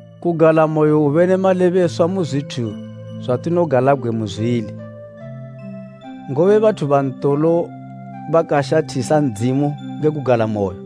Kugalamoyo hwube ne malebeswa mu zwithu zwatinogalabgwe mu zwili. Ngobe bathu ba ntolo bakashathisa Ndzimu nge kugalamoyo.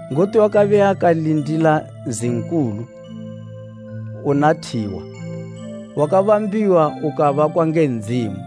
Ngoti wakabe akalindila nzi nkulu una thiwa, wakabambiwa ukabakwa nge Ndzimu.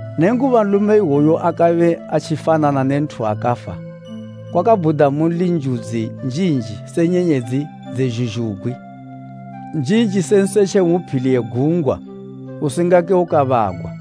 Nenguba nlume iwoyu akabe atjifanana ne nthu wakafa, kwakabhuda munli njudzi njinji se nyenyedzi dze zhuzhugwi, njinji se nsetje umu phili ye gungwa usingake ukabagwa.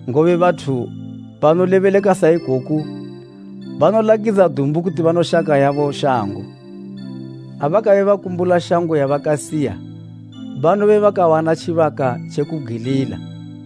Ngobe bathu banolebeleka sa ikoku banolakidza dumbu kuti banoshaka yabo shango. Ha bakabe bakumbula shango yabakasiya banobe bakawana tjibaka tje kubgwilila.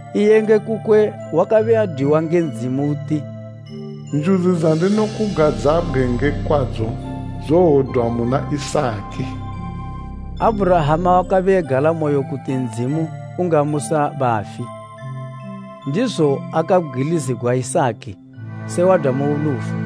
iye nge kukwe wakabe adwiwa nge Ndzimu uti, “Njudzi dzandinokugadzabgwe nge kwadzo dzowodwa muna Isaki.” Abhurahama wakabe egalamoyo kuti Ndzimu ungamusa bafi, ndizo akabgwilizigwa Isaki se wadwa mu lufu.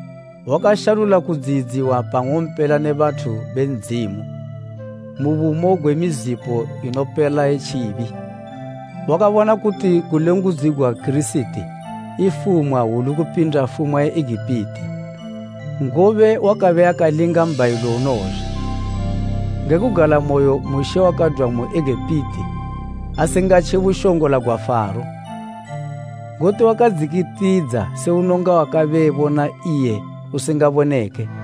Wakashalula kudziyidziwa pa ng'ompela ne bathu be Ndzimu mu bumo gwe mizipo inopela ye tjibi. Wakabona kuti kulengudzigwa Kirisiti ifumwa hwulu kupinda fumwa ye Egipiti, ngobe wakabe akalinga mbhayilo unowozha. Nge kugalamoyo Mushe wakadwa mu Egipiti asingatje bushongola gwa Faro, ngoti wakadzikitidza se unonga wakabe ebona iye usingaboneke.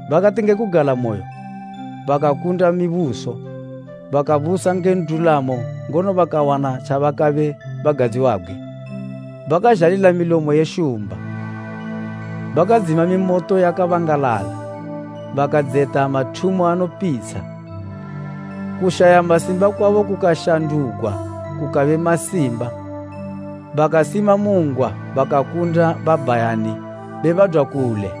Bakati nge kugalamoyo bakakunda mibuso, bakabusa nge ndulamo ngono bakawana tjabakabe bagadziwabgwe, bakazhalila milomo ye shumba, Bakadzima mimoto yakabangalala, bakadzeta mathumo anopitsha, kushaya masimba kwabo kukashandugwa kukabe masimba, bakasima mu ngwa bakakunda babhayani be badwa kule.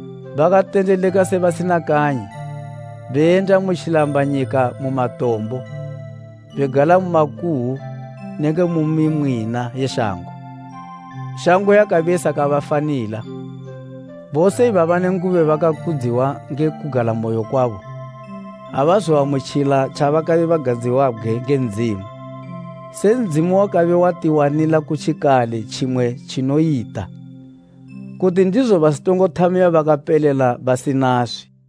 Bakatendeleka se basina kanyi, beyenda mu tjilambanyika mu matombo, begala mu makuhwu nenge mu mimwina ye shango. Shango yakabe isakabafanila. Bose ibaba nenguba bakakudziwa nge kugalamoyo kwabo, abazoamutjila tjakabe tjagadziwabgwe nge Ndzimu, se Ndzimu wakabe watiwanila kutjikale tjimwe tjinoyita, kuti ndizo basitongothamiwa bakapelela basinaswi.